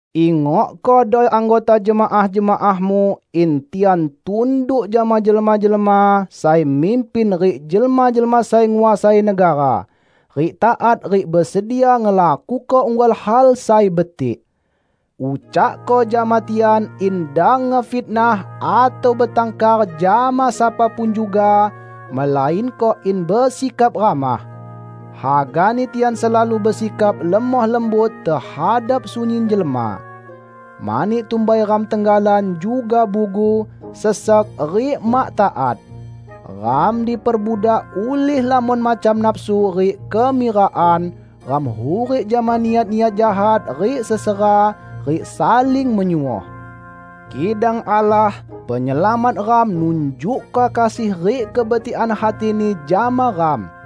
Ingokkodo anggota jemaah-jemaahmu in tian tunduk jama jelma-jelma sai mimpin rik jelma-jelma sai nguasai negara, rik taat rik besedia ngelakuko unggal hal sai betik. Ucakko jama tian in dang ngefitnah atau betangkar jama sapa pun juga, melainko in besikap ramah. Hagani tian selalu besikap lemoh lembut tehadap sunyin jelma. Mani tumbai ram tenggalan juga bugu, sesek rik mak taat. Ram diperbudak ulih lamon macam nafsu rik kemirakan; ram hurik jama niat-niat jahat rik sesera, rik saling menyuoh. Kidang Allah, Penyelamat ram nunjukko kasih rik kebetikan hati-Ni jama ram.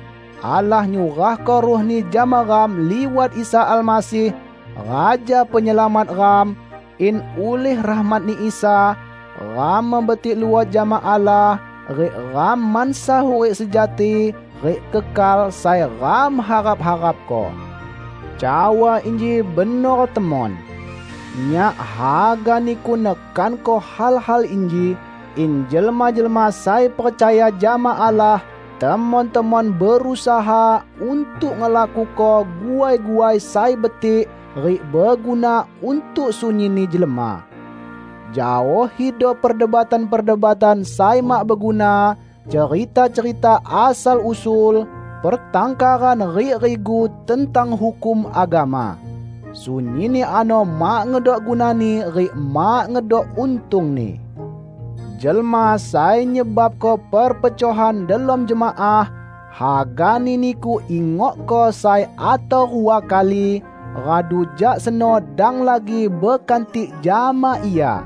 Allah nyurahko Ruh-Ni jama ram liwat Isa Almasih, Raja Penyelamat ram, in ulih rahmat-Ni Isa, ram mebetik luot jama Allah rik ram mansa hurik sejati rik kekal sai ram harap-harapko. Cawa inji benor temon. Nyak haga niku nekanko hal-hal inji, in jelma-jelma sai percaya jama Allah temon-temon berusaha untuk ngelakuko guai-guai sai betik rik beguna untuk sunyinni jelma. Jaohido perdebatan-perdebatan sai mak beguna, cerita-cerita asal-usul, pertangkaran rik rigu tentang hukum agama. Sunyinni ano mak ngedok gunani rik mak ngedok untungni. Jelma sai nyebabko perpecohan delom jemaah, hagani niku ingokko sai atau rua kali; radu jak seno dang lagi bekantik jama ia.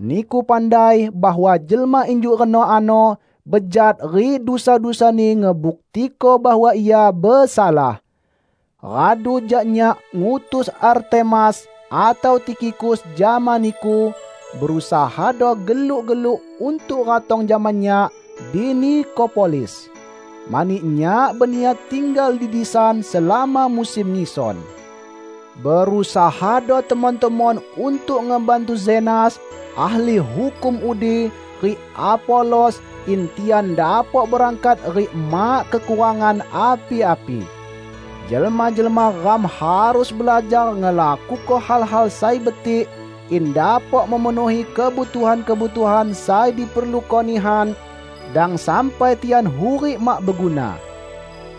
Niku pandai bahwa jelma injuk reno ano bejat rik dusa-dusani ngebuktiko bahwa ia besalah. Radu jak nyak ngutus Artemas atau Tikhikus jama niku, berusahado geluk-geluk untuk ratong jama nyak di Nikopolis, mani nyak beniat tinggal di disan selama musim ngison. Berusahado temon-temon untuk ngebantu Zenas, ahli hukum udi, rik Apolos, in tian dapok berangkat rik mak kekurangan api-api. Jelma-jelma ram harus belajar ngelakuko hal-hal sai betik in dapok memenuhi kebutuhan-kebutuhan sai diperluko nihan; dang sampai tian hurik mak beguna.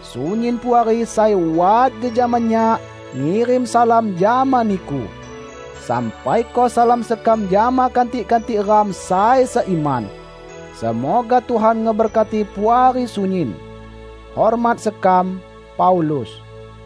Sunyin puari sai wat jejama nyak, ngirim salam jama niku. Sampaiko salam sekam jama kantik-kantik ram sai seiman. Semoga Tuhan ngeberkati Puari sunyin. Hormat sekam, Paulus